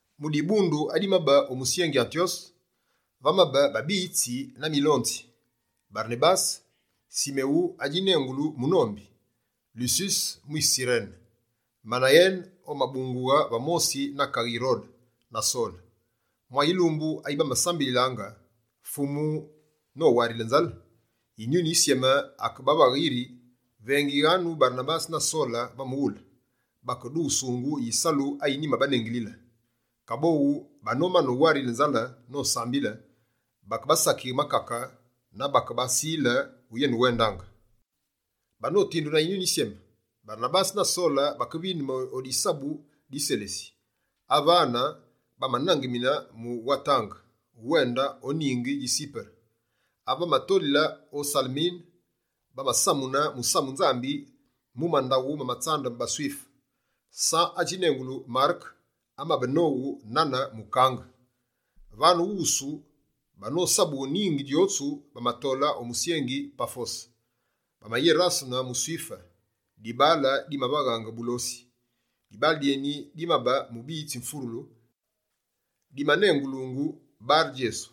Mu dibundu ayimabe o musyengi Antyose, vamabe babiyitsi na milonzi: Barenabase, Simewu adjinengulu «Munombi», Lususe mwise Sirene, Manayene omabungughe va mosi na kaghe Yirode, na Sole. Mwa yilumbu ayi bamayitsilaange Fumu nowarile nzale, Yinyuni Yisyeme akebavaghe yiri: «Vengighanu Barenabase na Sole va mughule, bakedughusungu yisalu ayi nyimabanengilile.» Kaboghu, banomane uwarile nzale nosambile, bakebasakighe makake na bakebasile uyenewende. Banotindu na Yinyuni Yisyeme, Barenabase na Sole bakevindeme o disabu di Selesi. Avane, bamanangemine mu watange muwende o ningi dji Sipere. Ave bamatolile o Salemine, bamasamune musamu Nzambi mu mandaghu ma tsambu ma baSwife. San adjinengulu Mareke amabe nowu nane mukange. Vane wusu, banosabughe ningi djotsu bamatole o musyengi Pafose, bamayerasene muSwife, dibaale dimavagha bulosi. Dibaale dyeni dimabe mubiyitsi wumfurulu, dimanengulu «Bare-Djesu».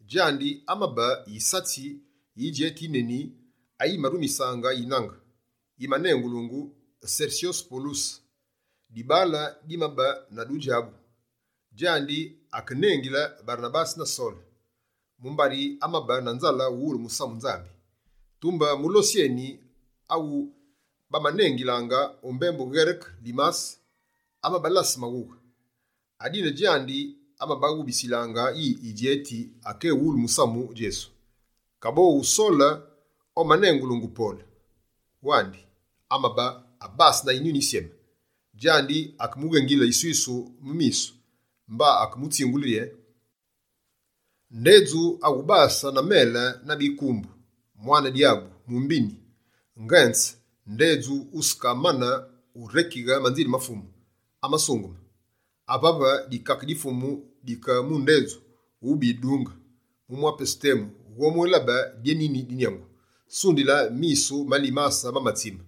Djandi, amabe yisatsi yi yidjeti yineni ayimarumisaange yinange, yi manenguluungu Sersyo Poluse, dibaale dimabe na dudjabu. Djandi akenengile Barenabase na Sole, mumbari amabe na nzale uwulu musamu Nzambi. Tumbe mulosi eni, awu bamanengilaange o mbembu Ngereke «Limase», amabalase maghughe. Adine djandi amabaghubitsilaange yi yidjeti akéwulu musamu Djesu. Kaboghu Sole omanengulungu «Pole» wandi, amabe abase na Yinyuni Yisyeme. Djandi akemughengile yiswisu mu misu, mba akemutsingule rye: «Ndedju awubase na mele na bikumbu, mwane dyabu, mumbini! Ngenze, ndedju wusekamane urekighe manzile ma Fumu amasungeme? Avave, dikake di Fumu dike mu ndedju, wube yidunge. Mu mwa pesu temu, wughobwélabe dyénini di nyangu.» Sundila, misu ma Limase mamatsime,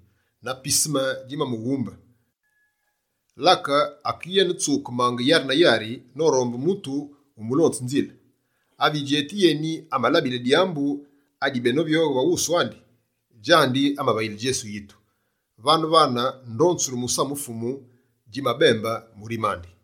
na piseme djimamughumbe, lake akeyenetsukemaange yari na yari, norombe mutu wumulonge nzile. Ave yidjeti yeni amalabile dyambu adibenovyoghe va wusu andi, djandi amavayile Djesu yitu. Vane-vane, ndonzulu musamu Fumu djimabembe murime andi.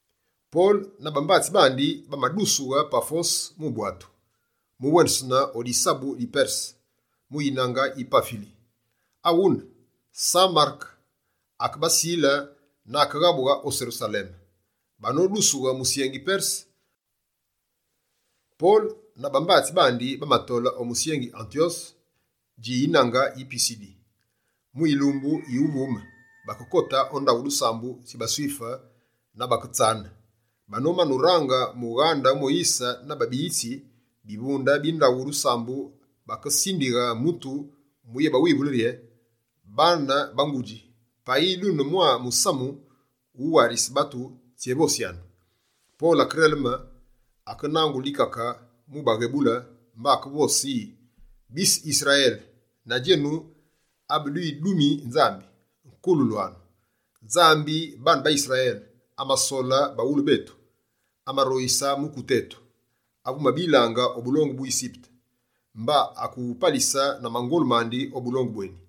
Pole na bambatsi bandi bamadusughe Pafose mu bwatu, muwendesene o disabu di Perse mu yinange yi Pafili. Aghune, San Mareke akebasile na akeghabughe o Serusaleme. Banodusughe musyengi Perse, Pole na bambatsi bandi bamatole o musyengi Antyose dji yinange yi Pisidi. Mu yilumbu yuvume, bakekote o ndaghu dusambu dji baSwife na baketsane. Banomane urange mughaghe Moyise na babiyitsi, bivunde bi ndaghu dusambu bakesindighe mutu muyebawivule rye: «Baane ba ngudji, payi dune mwa musamu mu warise batu, tsyévosyanu!» Pole akereleme, akenangule dikake mubaghebule mba akevose yi: «Bise Yisrayele na djenu abedwidumi Nzambi, nkulwanu! Nzambi baane ba Yisrayele, amasole baghulu betu. Amaroyise mukute eni, ave wumabilaange o bulongu bu Yisipete. Mba akewupalise na mangolu mandi o bulongu bweni.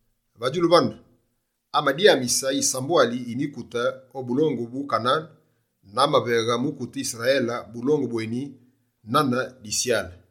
Va djulu vane, amadyamise yisambwali yi mikute o bulongu bu Kanane, na amaveghe mukute Yisrayele bulongu bweni nane disyale.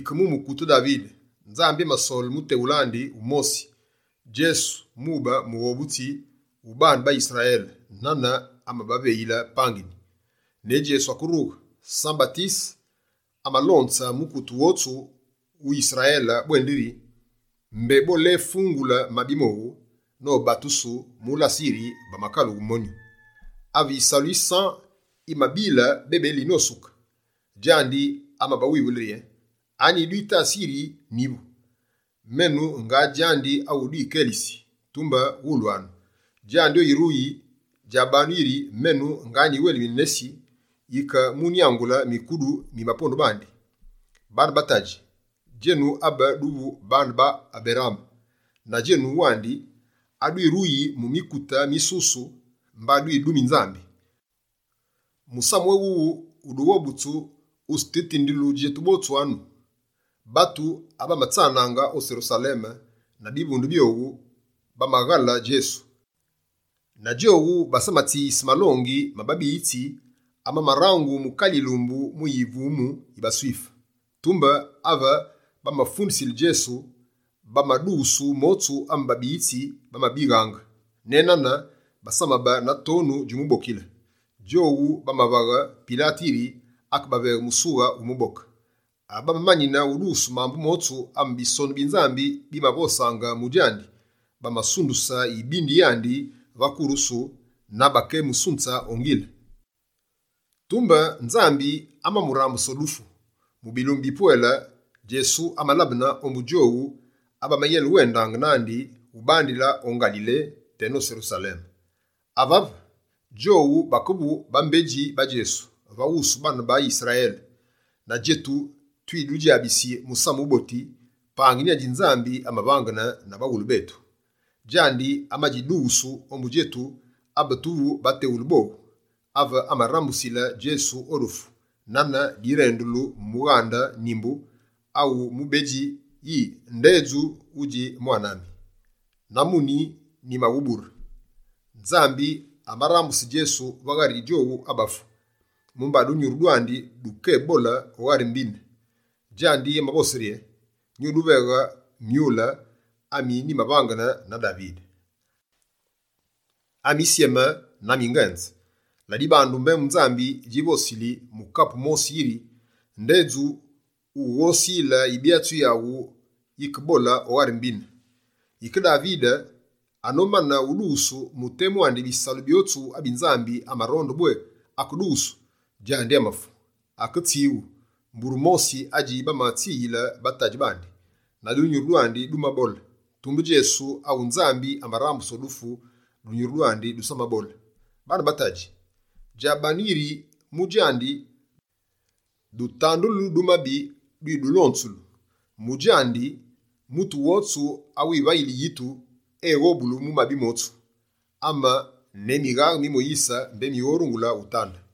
Yike mu mukute Davide, Nzambi amasole muteghule andi wumosi, Djesu mube Mughobutsi wu baane ba Yisrayele, nane amabaveyile pangini. Ne Djesu akerughe, San-Batise amalonze mukute wotsu wu Yisrayele bwendiri: mbé boléfungule mabi mowu, nobatusu mu lase yiri bamakalughe myonu. Ave yisalu yi San yimabile bebeli nosuke, djandi amabawivule rye: “Anyi dwitasi yiri nyivu? Menu, nga djandi awu dwikelisi. Tumbe wulwanu! Djandi oyiruyi, djabanu yiri: menu nga nyiwelmine, nesi yike mu munyangule mikudu mi bapondu bandi.”» «Bane ba tadji, djenu abe duvu baane ba Aberaame, na djenu wandi, adwiruyi mu mikute misusu mba dwidumi Nzambi, musamu éwuwu wu dughobutsu wutsitutindulu djetu botsu anu. Batu abamatsanaange o Serusaleme na bivunde byowu bamaghale Djesu, na djowu basamatsiyise malongi ma babiyitsi amamarangu mu kale yilumbu yuvume yi baSwife. Tumbe ave bamafundisile Djesu, bamadughusu motsu ame babiyitsi bamabighaange. Ne nane basamabe na tonu djumubokile, djowu bamavaghe Pilate yiri akeveghe musughe wumuboke. Ave bamamanine udughusu mambu motsu ame Bisonu bi Nzambi bimavosaange mu djandi, bamasunduse yibindi yandi va kurusu na bakemusunze o ngile. Tumbe Nzambi amamurambuse o dufu. Mu bilumbu bipwele, Djesu amalabene ombu djowu abamayenewendaange nandi ubandile o Ngalile teno Serusaleme. Avave, djowu bakevu bambedji ba Djesu va wusu baane ba Yisrayele. Na djetu, twidudjabisi Musamu Wuboti, pangini adji Nzambi amavangene na baghulu betu. Djandi amadjidughusu ombu djetu abe tuvu bateghule bowu, ave amarambusile Djesu o dufu. Nane direndulu mu mughande Nimbu awu mubedji yi: “Ndedju wudji mwane ami, na muni, nyimawubure.” Nzambi amarambuse Djesu va ghari djowu abafu, mumba dunyuru dwandi dukeyébole o ghari mbine. Djandi amavose rye: “Nyuduveghe myule, ami nyimavangene na Davide, amisyeme na mi ngenze.” Ladibandu, mbembu Nzambi djivosili mu kapu mosi yiri: “Ndedju wughosile Yibyatsi yaghu Yisyeme, yikebole o ghari mbine.” Yike Davide, anomane udughusu mu temu andi bisalu byotsu abi Nzambi amaronde bwé akedughusu, djandi amafu. Aketswighu mbure mosi adji bamatswiyile batadji bandi, na dunyuru dwandi dumabole. Tumbe Djesu awu Nzambi amarambuse o dufu, dunyuru dwandi dusamabole. Baane ba ngudji, djabanu yiri: mu djandi, dutandu du mabi dwidulonzulu. Mu djandi, mutu wotsu awimuvayili yitu, eghobulu mu mabi motsu, ame ne mighaghe mi Moyise mbé mighorungule utande.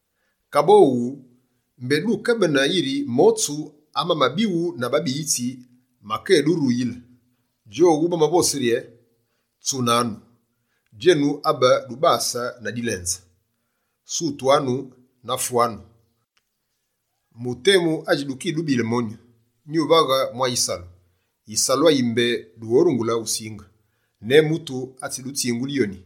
Kaboghu, mbé dukebene yiri motsu amamabighu na babiyitsi makéduruyile. Djowu bamavose rye: “Tsunanu, djenu abe dubase na dilenze. Sutwanu na fwanu! Mu temu adji dukidubile monyu, nyuvaghe mwa yisalu. Yisalu ayi mbé dughorungule usinge, ne mutu atsidutsingule yoni.”»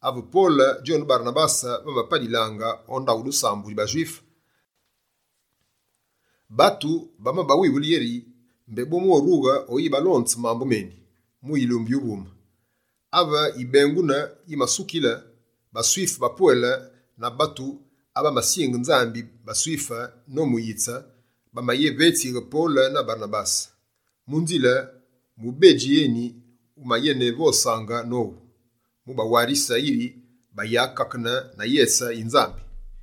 Ave Pole djone Barenabase bamapalilaange o ndaghu dusambu dji baSwife, batu bamabawivule yeri, mbé bomwérughe oyibalonze mambu meni, mu yilumbu yuvume. Ave yibengunu yimasukile, baSwife bapwele na batu abamasinge Nzambi baSwife nomuyitse, bamayevetsighe Pole na Barenabase. Mu nzile, mubedji eni wumayenevosaange nowu, mu bawarise yiri bayakakene na yese yi Nzambi.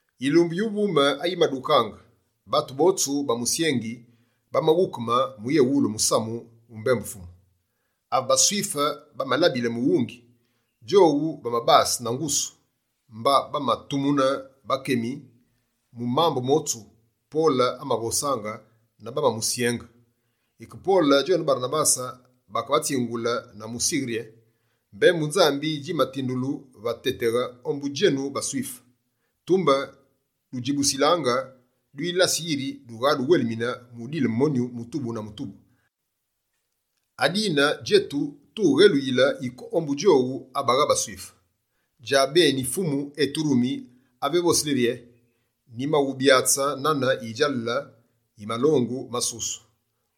Yilumbu yuvume ayimadukaange, batu botsu ba musyengi bamaghukeme mu yéwulu musamu wu mbembu Fumu. Ave baSwife bamalabile mughungi, djowu bamabase na ngusu, mba bamatumune bakemi mu mambu motsu Pole amavosaange na bamamusyenge. Yike Pole djone Barenabase bakebatsingule na musighe rye: «Mbembu Nzambi djimatindulu va téteghe ombu djenu baSwife. Tumbe dudjibusilaange, dwilasi yiri dughaduwelmine mudile monyu mutubu na mutubu! Adine djetu, tughéluyile yike ombu djowu abagha baSwife. Djabeni Fumu eturumi ave evosili rye: “Nyimawubyatse nane yidjalale yi malongu masusu,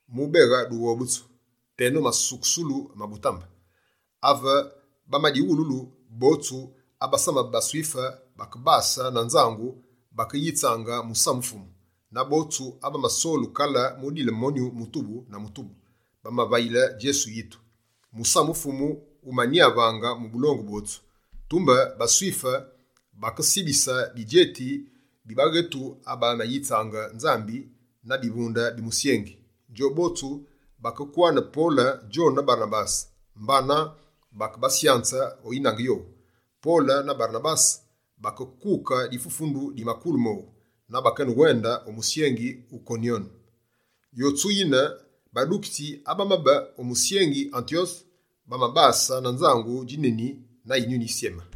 mubeghe dughobutsu teno masukusulu ma butambe!”» Ave bamadighululu, botsu abasamabe baSwife bakebase na nzangu, bakeyitsaange musamu Fumu. Na botsu abamasolu kale, mudile monyu mutubu na mutubu, bamavayile Djesu yitu. Musamu Fumu wumanyavaange mu bulongu bwotsu. Tumbe baSwife bakesibise bidjeti bi baghetu abamayitsaange Nzambi na bivunde bi musyengi. Djobotsu bakekwane Pole djone Barenabase, mba bakebasyanze o yinange yowu. Pole na Barenabase bakekuke difufundu di makulu mowu na bakewende o musyengi Yikonyome. Yotsu yine, badukitsi abamabe o musyengi Antyose, bamabase na nzangu djineni na Yinyuni Yisyeme.